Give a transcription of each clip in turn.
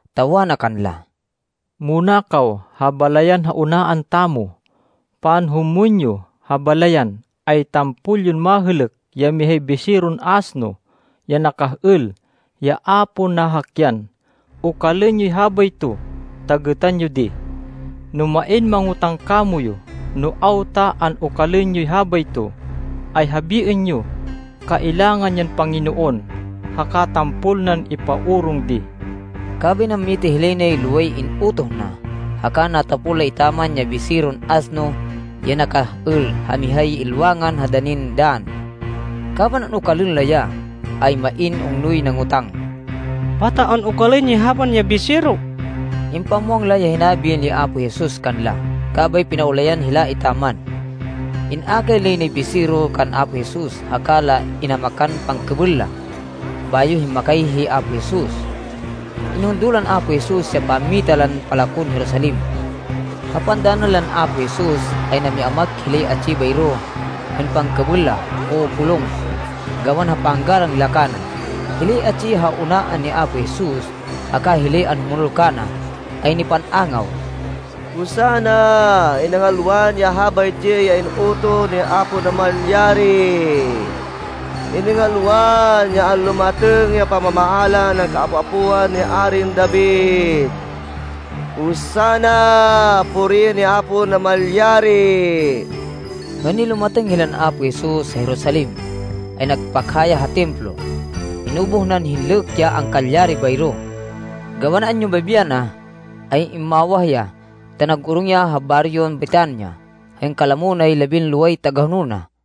ta wana kanla, “Muna kaw ha balayan ha unaan tamo. Panhumwên yo ha balayan, ay tampol yon mahêlêk ya mihay biseron asno, ya nakah-êl, ya a pon nahakyan. Okalên yoy habayto, ta gêtan yo di. No main mangotáng kamoyu no awta an-okalên yoy habayto, ay habiên yo, ‘Kailangan yan Panginoon haka tampol nan ipaorong di.’” Kabay nammita hilay nay loway in-utoh na. Haka natapol la etaman ya biseron asno ya nakah-êl ha mihay ilwangan ha danin dann. Kaban an-okalên la ya, ay main ungnoy nangotang, “Pata an-okalên yoy habain ya bisero?” Impamwang la ya hinabi ni Apo Jesus kanla. Kabay pinaulayan hila etaman. In-akay lay nay bisero kan Apo Jesus, haka la inamakan pangkêbêl la, bayo himmakay hi Apo Jesus. Inhundo lan Apo Jesus ya pammita lan palakon Jerusalem. Ha pandanan lan Apo Jesus, ay nami-amak hilay atsi bayro hên pangkêbêl la o bulong, gawan ha panggalang la kana. Hilay atsi ha unaan ni Apo Jesus haka hilay anhumonol kana ay nipan-angaw, “Hosanna! Iningalwan ya habaytsi ya in-utoh ni Apo Namalyari! Iningalwan ya anlumatêng ya pamamaala nan kaapo-apoan ni Arin David! Hosanna! Puriên hi Apo Namalyari!” Hên nilumatêng hilan Apo Jesus ha Jerusalem, ay nagpakha ya ha Templo. Inubuh nan hinlêk ya angkalyari bayro. Gawan anyumabi yana, ay immawah ya ta nag-orong ya ha baryon Betania, hên kalamo nay labinloway tagahonol na.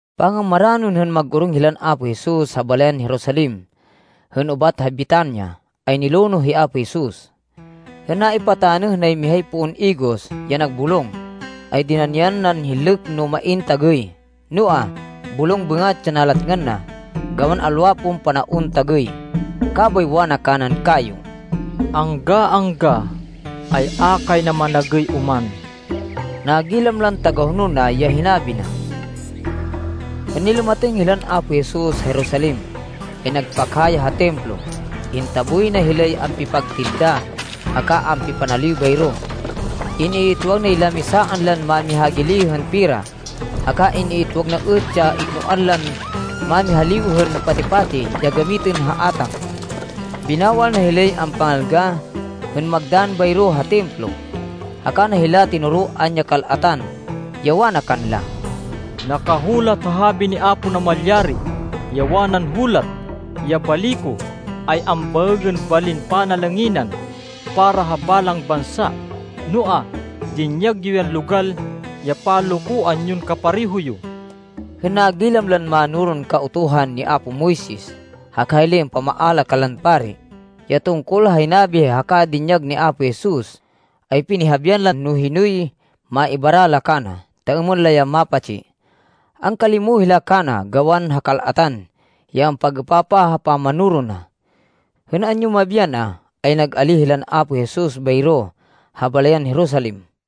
Pangamaranon hên mag-orong hilan Apo Jesus ha balayan Jerusalem hên ubat ha Betania, ay nilonoh hi Apo Jesus. Hên naipatanêh nay mihay poon igos ya nagbulong, ay dinanian nan hinlêk no main tagêy. Noa, bulong bêngat ya nalatngan na gawan alwa pon panaon tagêy. Kabay wana kanan kayo, “Angga-angga, ay a kay na managêy oman!” Nagilam lan tagahonol na ya hinabi na. Hên nilumatêng hilan Apo Jesus ha Jerusalem, ay nagpakha ya ha Templo. Intaboy na hilay ampipagtinda haka ampipanaliw bayro. In-iitwag nay lamisaan lan mámihagili hên pera, haka in-iitwag na êt ya iknoan lan mámihaliw hên pati-pati ya gamitên ha átang. Binawal na hilay ampangalga, hên magdann bayro ha Templo. Haka na hila tinoroan ya kal-atan, ya wana kanla, “Nakahulat ha habi ni Apo Namalyari, ya wanan hulat, ‘Ya bali ko, ay ambaêgên balin panalanginan para ha balang bansa.’ Noa, dinyag yo yan logal ya panlokoan yon kapareho yo!” Hên nagilam lan mánoron Kautuhan ni apo Moises, haka hilay ampamaala kanlan pari, ya tungkol ha hinabi haka dinyag ni Apo Jesus, ay pinihabian la no hinoy maibara la kana, ta êmên la ya mapatsi. Angkalimo hila kana, gawan ha kal-atan ya ampag-êpapah ha pamanoro na. Hên anyumabi yana, ay nag-alíh hilan Apo Jesus bayro ha balayan Jerusalem.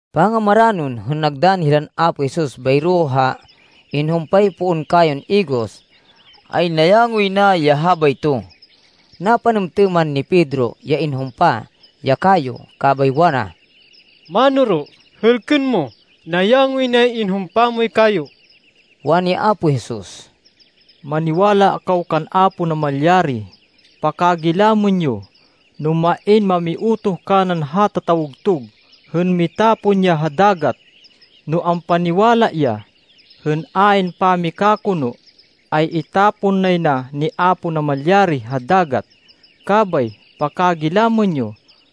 Pangamaranon, hên nagdann hilan Apo Jesus bayro ha inhumpay poon kayon igos, ay nayangoy na ya habayto. Napanêmtêman ni Pedro ya inhumpa ya kayo, kabay wana, “Manoro, hêlkên mo! Nayangoy nay inhumpa moy kayo!” Wani Apo Jesus, “Maniwala kaw kan Apo Namalyari. Pakagilamên yo, no main mamiutoh kanan hata tawgtug hên mitapon ya ha dagat, no ampaniwala ya, hên ayn pamikakono, ay itapon nay na ni Apo Namalyari ha dagat. Kabay, pakagilamên yo,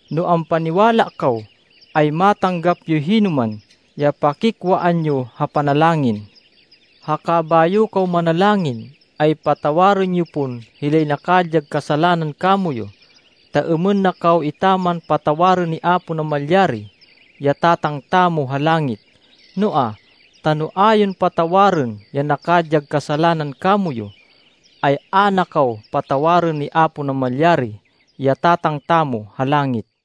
no ampaniwala kaw, ay matanggap yoy hinoman ya pakikwaan yo ha panalangin. Haka bayo kaw manalangin, ay patawarên yo pon hilay nakadyag kasalanan kamoyu, ta êmên na kaw etaman patawarên ni Apo Namalyari, ya Tatang tamo ha langit. Noa, ta no a yon patawarên ya nakadyag kasalanan kamoyu, ay a na kaw patawarên ni Apo Namalyari, ya Tatang tamo ha langit.”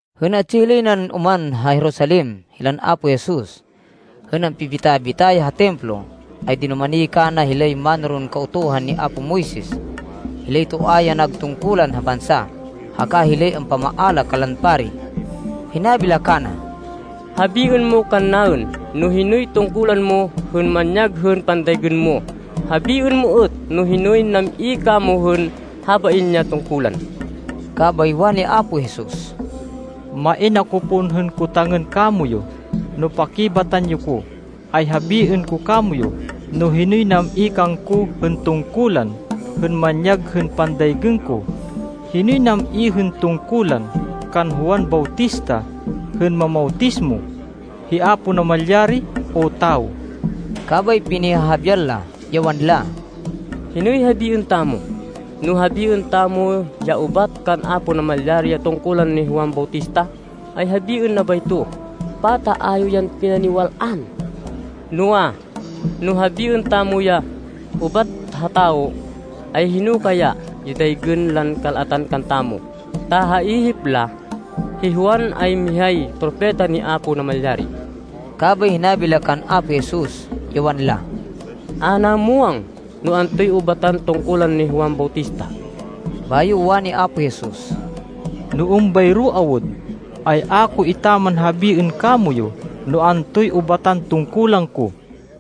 Hên atsi hilay nan oman ha Jerusalem hilan Apo Jesus, hên ampibita-bita ya ha Templo, ay dinumani kana hilay mánoron Kautuhan ni apo Moises, hilay toa ya nag tungkulan ha bansa, haka hilay ampamaala kanlan pari. Hinabi la kana, “Habiên mo kannaên no hinoy tungkulan mo hên manyag hên pandaygên mo. Habiên mo êt no hinoy nam-i kamo hên habain ya tungkulan.” Kabay wani Apo Jesus, “Main ako pon hên kotangên kamoyu. No pakibatan yo ko, ay habiên ko kamoyu no hinoy nam-i kangko hên tungkulan hên manyag hên pandaygên ko. Hinoy nam-i hên tungkulan kan Juan Bautista hên mamawtismo? Hi Apo Namalyari o tawo?” Kabay pinihahabian la, ya wanla, “Hinoy habiên tamo? No habiên tamo ya ‘Ubat kan Apo Namalyari ya tungkulan ni Juan Bautista,’ ay habiên na bayto, ‘Pata a yo yan pinaniwal-an?’ Noa, no habiên tamo ya ‘Ubat ha tawo,’ ay hino kaya ya daygên lan kal-atan kantamo, ta ha ihip la, hi Juan ay mihay propeta ni Apo Namalyari.” Kabay hinabi la kan Apo Jesus, ya wanla, “A naên muwang no antoy ubatan tungkulan ni Juan Bautista.” Bayo wani Apo Jesus, “No êmbayro awud, ay a ko etaman habiên kamoyu no antoy ubatan tungkulan ko.”